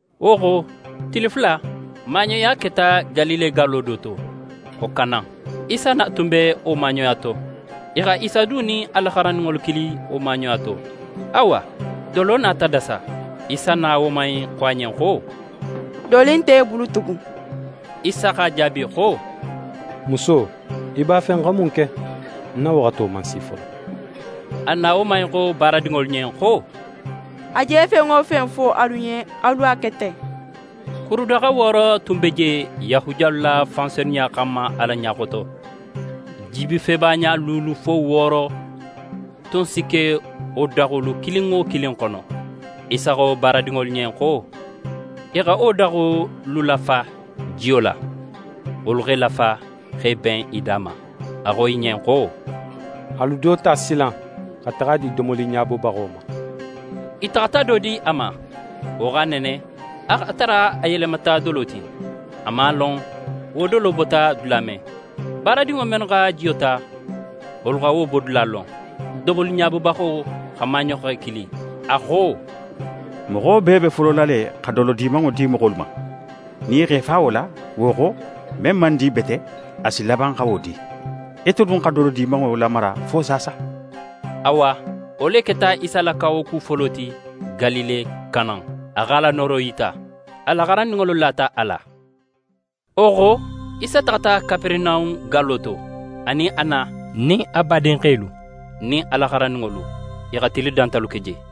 Wo xo tili fula, maaɲoya keta Galile gallo do to, xo Kana. Isa na tun be wo maaɲoya to. I xa Isa du nin a la xarandinŋolu kili wo maaɲoya to. Awa dolo nata dasa. Isa na woman in xo a ɲen xo: «Doli nt'e bulu tugun.» Isa x'a jaabi xo: «Muso, í b'a fe ń xa mun ke? Ń na waxato man si folo.» A na woman in xo baaradinŋolu ɲen xo: «A je fen wo fen fo alu ɲen, alu a ke ten.» Kurudaxa wooro tun be je Yahudiyalu la fansenuya xanma Ala ɲa xoto. Jibifeba ɲa luulu fo wooro tun si ke wo daxolu kilin wo kilin xono. Isa xo baaradinŋolu ɲen xo i xa wo daxolu lafa jiyo la. Wolu x'e lafa, x'e ben i da ma. A xo i ɲen xo: «Alu do ta silan, xa taxa a di domoliɲabobaxo ma.» I taxata do di a ma. Wo x'a nene, a x'a tara a yelemata dolo ti. A man a lon, wo dolo bota dula men. Baaradinŋo mennu xa jiyo ta, wolu xa wo bodula lon. Domoliɲabobaxo xa maaɲoxe kili. A xo: «Moxo bee be folola le xa dolo dimanŋo di moxolu ma. Nin i x'e fa wo la, wo xo, men man di bete, a si laban xa wo di. Ite dun xa dolo dimanŋo lamara fo saasa?» Awa wo le keta Isa la kawaku folo ti, Galile Kana. A x'a la nooro yita. A la xarandinŋolu lata a la. Wo xo, Isa taxata Kaperenahun gallo to, a nin a na nin a badinxelu nin a la xarandinŋolu. I xa tili dantalu ke je.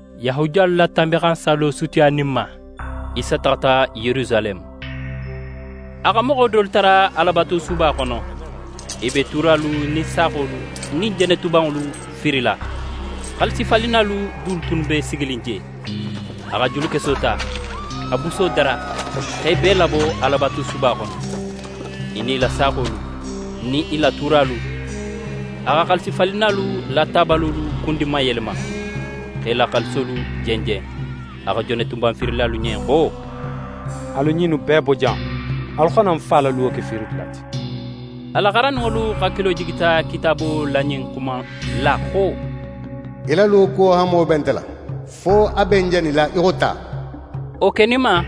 Yahudiyalu la Tanbinxansallo sutiyaninma, Isa taxata Yerusaleme. A xa moxo dolu tara Alabatusuba xono, i be tuuralu nin saaxolu nin jenetubanŋolu fiirila. Xaalisifalinnalu du tunnu be siginin je. A xa julukeso ta xa buso dara, x'e bee labo Alabatusuba xono, i nin i la saaxolu nin i la tuuralu. A xa xaalisifalinnalu la tabalolu kundinmayelema, x'e la xaalisolu jenjen. A xo jenetuban fiirilalu ɲen xo: «Alu ɲinnu bee bo jan. Alu xana ń Fa la luwo ke fiirikedula ti.» A la xarandinŋolu hakilo jigita Kitaabo la ɲin xuma innu la xo: «Í la luwo kuwo hanmo be nte la, fo a be ń janila í xo ta.» Wo keninma,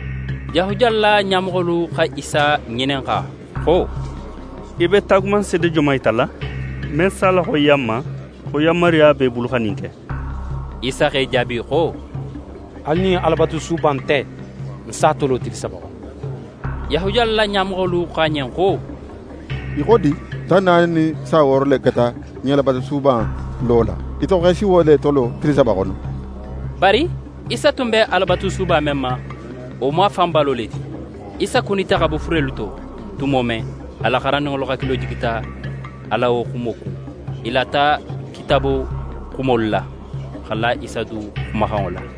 Yahudiyalu la ɲamoxolu xa Isa ŋininxa xo: «Í be taagumanseede joman yitala, men s'a laxoyiya n ma, xo yanmaruya b'é bulu xa ɲin ke?» Isa x'e jaabi xo: «Alu ɲin Alabatusuba in te. Ń s'a tolo tili saba xono.» Yahudiyalu la ɲamoxolu xo a ɲen xo: «Í xo di? Tan naani nin san wooro le keta ɲin Alabatusuba in lo la. Ite xo x'é si wo le tolo tili saba xono?» Bari Isa tun be Alabatusuba men ma, wo mu a fan balo le ti. Isa kunita xa bo furelu to tumo men, a la xarandinŋolu hakilo jigita a la wo xumo kun. I lata Kitaabo xumolu la, xa la Isa du xumaxanŋo la.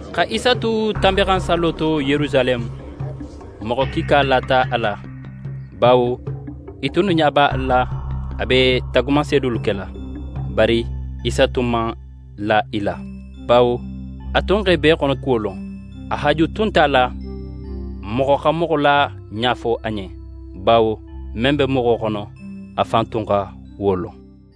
Xa Isa tu Tanbinxansallo to Yerusaleme, moxo kiika lata a la, bawo i tunnu ɲa b'a la a be taagumanseedolu kela. Bari Isa tun man la i la, bawo a tun x'e bee xonokuwo lon. A haaju tun nt'a la, moxo xa moxo la ɲa fo a ɲen, bawo men be moxo xono, a fan tun xa wo lon.